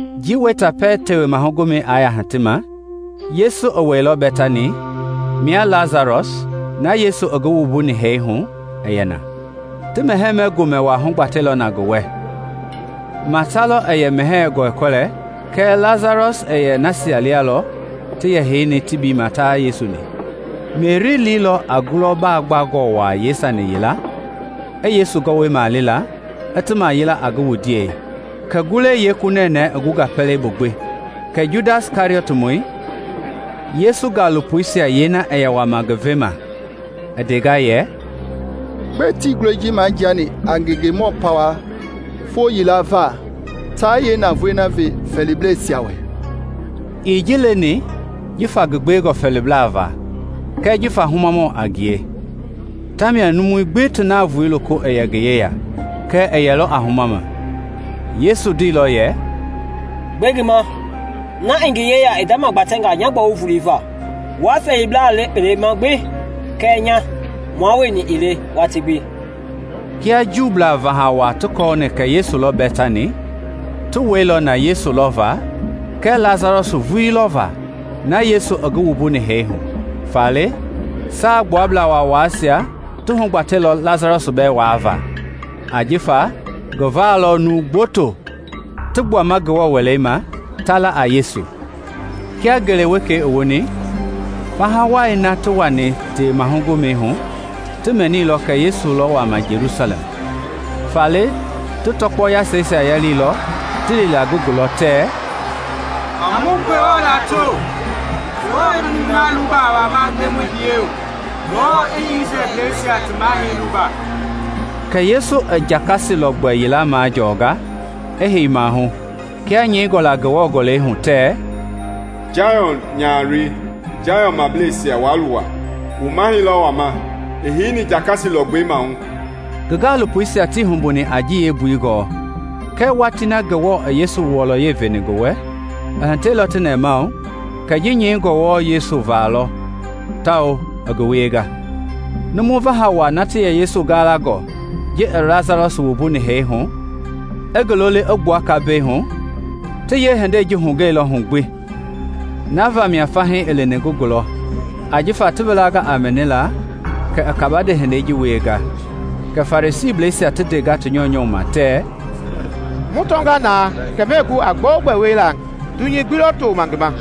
Njii wɛita pɛiŋ Tewema Gomɛi i yaa hiti ma, Yesu i wɛilɔ Bɛtani, mia Lasarɔs na Yesu i ngi wuni hee hu i yɛ na. Ti mɛhɛɛ gomɛ wa hugbatɛilɔ na ngi wɛ; Mata lɔ i yɛ mɛhɛɛi gɔlɛkɔlɛ kɛɛ Lasarɔs i yɛ nasia lia lɔ ti yɛ heini tebiima tia Yesu-ni. Meri liilɔ a ngulɔ baa gbangɔ waa yeesani yila i Yesu gɔwɔisia mali la, i ti mayila a ngi wundiei; kɛ ngulɔi yeeku nɛnɛɛ i gunga pɛlei bu gbi. Kɛ Judas Kɛriɔtmɔi, Yesu gaalopoisia yeena i wama ngi vema i ndenga yɛ, “Gbɛe tii ngulɔi ji majiani a ngengemɔ pawa foo yila va, taa yeenavoei ve fɛɛliblɛisia wɛ?” Ii ji leni jifa ngi gbewengɔ fɛɛlibla va kɛɛ jifa humamɔ a ngie. Ta mia numui gbi ti navoei loko i yɛ ngi yeya kɛɛ i yɛlɔ a huma ma. Yesu ndeilɔ yɛ, “Gbe ngi ma, na i ngi yeya i ndamagbatɛ nya gbɔwu volei va. Wua fɛɛlibla le kpelema gbi kɛɛ nya, mua wueni ii le watii gbi.” Kia Juu vaha waa ti kɔɔni kɛ Yesu lɔ Bɛtani, ti wɛilɔ na Yesu va kɛɛ Lasarɔs vuii lɔ va na Yesu i ngi wuni hee hu. Faale Saagbuablaa Waawaisia ti hugbatɛilɔ Lasarɔs bɛɛ waava, ajifa ngi va lɔ numu gboto ti gbuama Ngewɔ Wɛlei ma, ta la a Yesu. Kia ngele wekei i woni, faha wai na ti wani Tewema Gomɛi va ti mɛnilɔ kɛ Yesu lɔ wama Jelusalɛm. Faale ti tɔkpɔ yasɛisia yaliilɔ ti li la ngi gulɔ tɛɛ, “A mu Ngewɔ lato! Ngewɔ i numui na luba i wama Ndemɔi biyɛi hu; Ngewɔ i Isrɛlbleisia ti Mahɛi Luba!” Kɛ Yesu i jakasi lɔgbɛ yila majɔɔnga, i hei maahu; kia nyɛingɔ la Ngewɔ Gɔlɛi hu tɛɛ, “Sayɔn nyahaloi, Sayɔnblɛisia waa luwa; wu mahɛi lɔ wama, i heini jakasi lɔgbɛi maahu!” Ngi gaalopoisia tii humbuni a ji yeembui gɔɔ; kɛɛ watii na Ngewɔ i Yesu wɔlɔyei veni ngi wɛ, i hitɛilɔ ti wɛ kɛ ti ji nyɛini wɔɔ Yesu va lɔ tawao i ngi wienga. Numu vaha wai na ti yɛ Yesu galangɔ ji i Lasarɔs wuni hee hu, i ngi loli i gbua kambɛi hu, ti yeehindei ji hugɛilɔ hu gbi. Na vamia fahii i lini ngi gulɔ ajifa ti wilanga a mɛnila kɛ i kabande hindei na wienga. Kɛ Farisiisia ti ndenga ti nyɔunyɔ ma tɛɛ, “Wu tɔnga na kɛ muɛɛ gu a gbɛogbɛ wiela; dunyei gbi lɔ toma ngi ma.”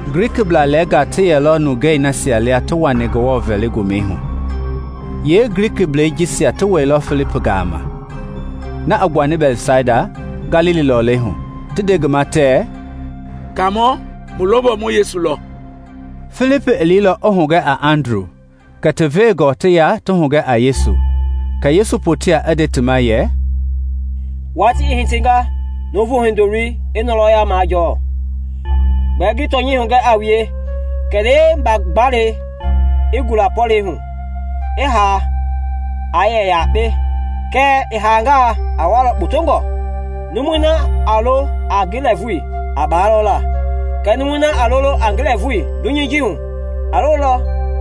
Glikiblaa lɛɛnga ti yɛlɔ nungei nasia lia ti lini Ngewɔ vɛlima Komɛi hu. Yeeglikiblɛi jisia ti wailɔ Filipi gama, na i gbuani Bɛtsaida, Galili lɔlei hu, ti nde ngi ma tɛɛ, “Kaamɔ, mu longɔ mu Yesu lɔ.” Filipi i liilɔ i hugɛ a Andru kɛ ti veengɔ ti ya ti hugɛ a Yesu. Yesu i poteilɔ i nde ti ma yɛ, “Watii i hitinga Nuuvu Hindoloi i ngɔlɔya majɔɔ. Gbɛɛ ngi tɔnyɛi hugɛ a wue, kɛlee mba-gaalei i gula pɔlɛi bu, i haa, a yɛ yakpe; kɛɛ i haangaa, a walɔ kpotongɔ. Numui na a lo a ngi lɛɛvui a baalɔ la kɛɛ numui na a lolo a ngi lɛɛvui dunyei ji hu, a lolɔ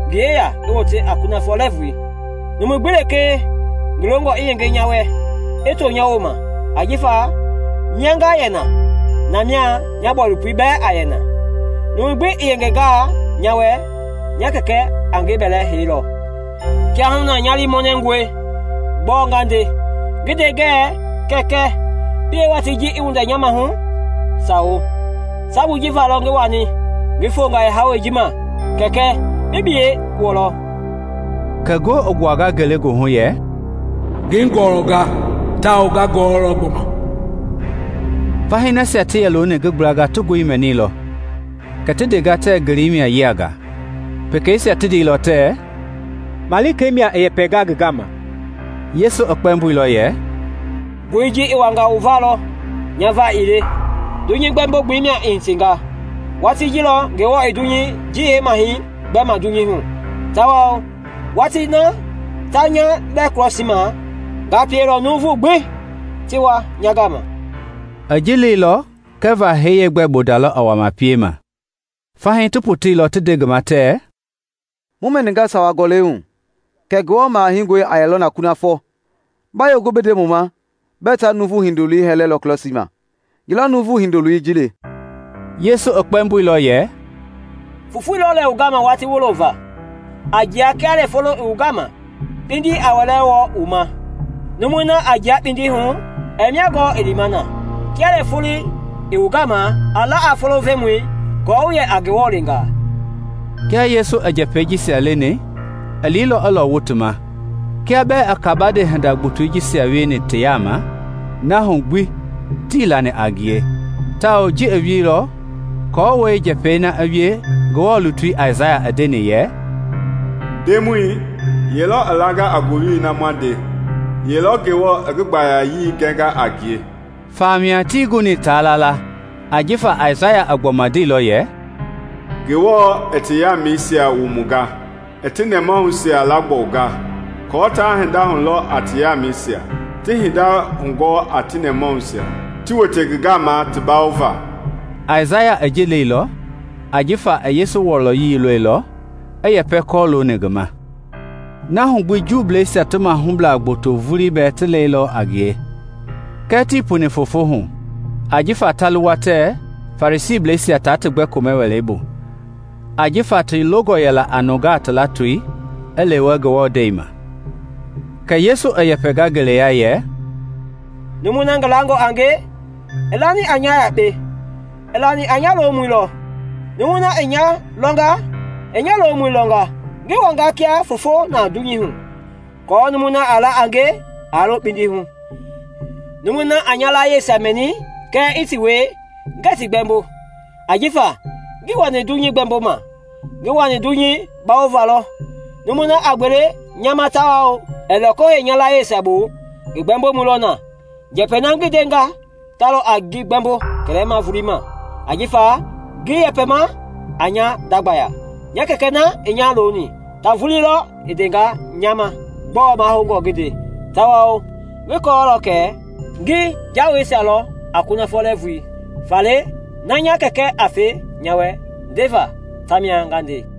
ngi yeya i wote a kunafɔ lɛɛvui. Numu gbi lekee ngi longɔ i yenge nya wɛ, i to nya wooma; ajifa mia nga yɛ na, na mia nya bɔilopoi bɛɛ a yɛ na; numu gbi i yengengaa nya wɛ, nya Kɛkɛ a ngi bɛlɛ heilɔ. “Kiahuna nya liimɔnɛngɔe. Gbɔɔ nga nde? Ngi nde ngɛɛ, ‘Kɛkɛ, pie watii ji i windɛ nya maahu?’ Sawo, sabui ji va lɔ ngi wani, ngi fonga yeehawɛi ji ma. Kɛkɛ, bi biyɛi wɔlɔ.” Kɛ ngoo i gbuanga ngelegoohu yɛ, “Ngi ngɔlɔnga, tawao nga ngɔɔlɔ gbɔma.” Fahii nasia ti yɛ looni ngi gblanga ti ngoi mɛnilɔ kɛ ti ndenga tɛɛ ngelei mia i yianga. Pekeisia ti ndeilɔ tɛɛ, “Malika mia i yɛpɛnga ngi gama.” Yesu i kpɛmboilɔ yɛ, “Ngoi ji i wanga wu va lɔ, nya va ii le. Dunyei gbɛmbo-gbelei mia i hitinga; Watii ji lɔ Ngewɔ i dunyei ji yeemahɛi gbɛma dunyei hu; tawao watii na ta nya lɛ krɔsii ma, nga pielɔ nuuvui gbi ti wa nya gama.” I ji leilɔ kɛva hee yeegbɛ bonda lɔ i wama piema. Fahii ti poteilɔ ti nde ngi ma tɛɛ, “Mu mɛninga sawa gɔlɛi hu kɛ Ngewɔ Maha Heingɔi a yɛlɔ na kunafɔ. Ba yee gu bi nde mu ma bɛɛ ta Nuuvu Hindoloi hɛlɛlɔ krɔsii ma? Ye lɔ Nuuvu Hindoloi ji le?” Yesu i kpɛmboilɔ yɛ, “Fofoi lɔ lɛ wu gama watii wulo va. A jia kia lɛ fofoi i wu gama, kpindi aa wɛlɛ wɔi wu ma; numui na a jia kpindi hu, ɛɛ mia gɔɔ i lima na. Kia lɛ fofoi i wu gama, a la a fofoi vemɔi aako wu yɛ a Ngewɔ leengaa.” Kia Yesu i njɛpɛi jisia leni, i liilɔ i lɔwu ti ma. Kia bɛɛ i kabande hinda gbotoi jisia wieni ti yaama, na hu gbi tii lani a ngie; tawao ji i wielɔ hii aako njɛpɛi na i wie Ngewɔ lutui Aisaya i ndeni yɛ, “Ndemɔi, Ye lɔ i langa a ngowili na mu ndenga? Ye lɔ Ngewɔ i ngi gbayayii gɛnga a ngie?” Famia tii guni a lala la ajifa Aisaya i gbɔma ndeilɔ yɛ, “Ngewɔ i ti yamɛisia wumunga, i ti nɛmahuisia laagbɔwunga, aako taa hinda lɔ a ti yamɛisia, ti hinda hugɔɔ a ti nɛmahuisia, ti wote ngi gama ti bawova.” Aisaya i ji leilɔ ajifa i Yesu wɔlɔyei lɔilɔ, i yɛpɛ kɔlooni ngi ma. Na hu gbi Juuisia ti mahublaa gboto vulii bɛɛ ti lɛilɔ a ngie, kɛɛ tii puni foofo hu ajifa ta luwa tɛɛ Farisiisia taa ti gbɛ komɛ wɛlei bu; ajifa ti longɔ yɛla a nuuvungaa ti latoi i lewe Ngewɔ ndɛi ma. Kɛ Yesu i yɛpɛnga ngeleya yɛ, “Numui na ngi langɔ a nge, ii lani a nya yakpe; i lani a nya lomɔi lɔ. Numui na i nya lɔnga, i nya lomɔi lɔnga. Ngi wanga kia foofo na dunyei hu, aako numui na lekee a la a nge aa lo kpindi hu. Numui na a nya layieisia mɛni kɛɛ ɛɛ ti wie, ngɛɛ ngi gbɛmbo; ajifa ngii wani dunyei gbɛmboma, ngi wani dunyei bawova lɔ. Numui na a gbele nya ma tawao ɛɛ loko hei nya layieisia bu, ngi gbɛmbomɔi lɔ na; njɛpɛi na ngi ndenga ta lɔ a ngi gbɛɛmbo kɛlɛma volei ma. Ajifa ngii yɛpɛma a nya nda gbaya; nya Kɛkɛ na i nya loni, ta vulii lɔ i ndenga nya ma gbɔɔ mahoungɔ ngi nde. Tawao ngi kɔɔlɔ kɛ ngi jawei lɔ a kunafɔ lɛɛvui. Faale na nya Kɛkɛ a fe nya wɛ ndeva, ta mia nga nde.”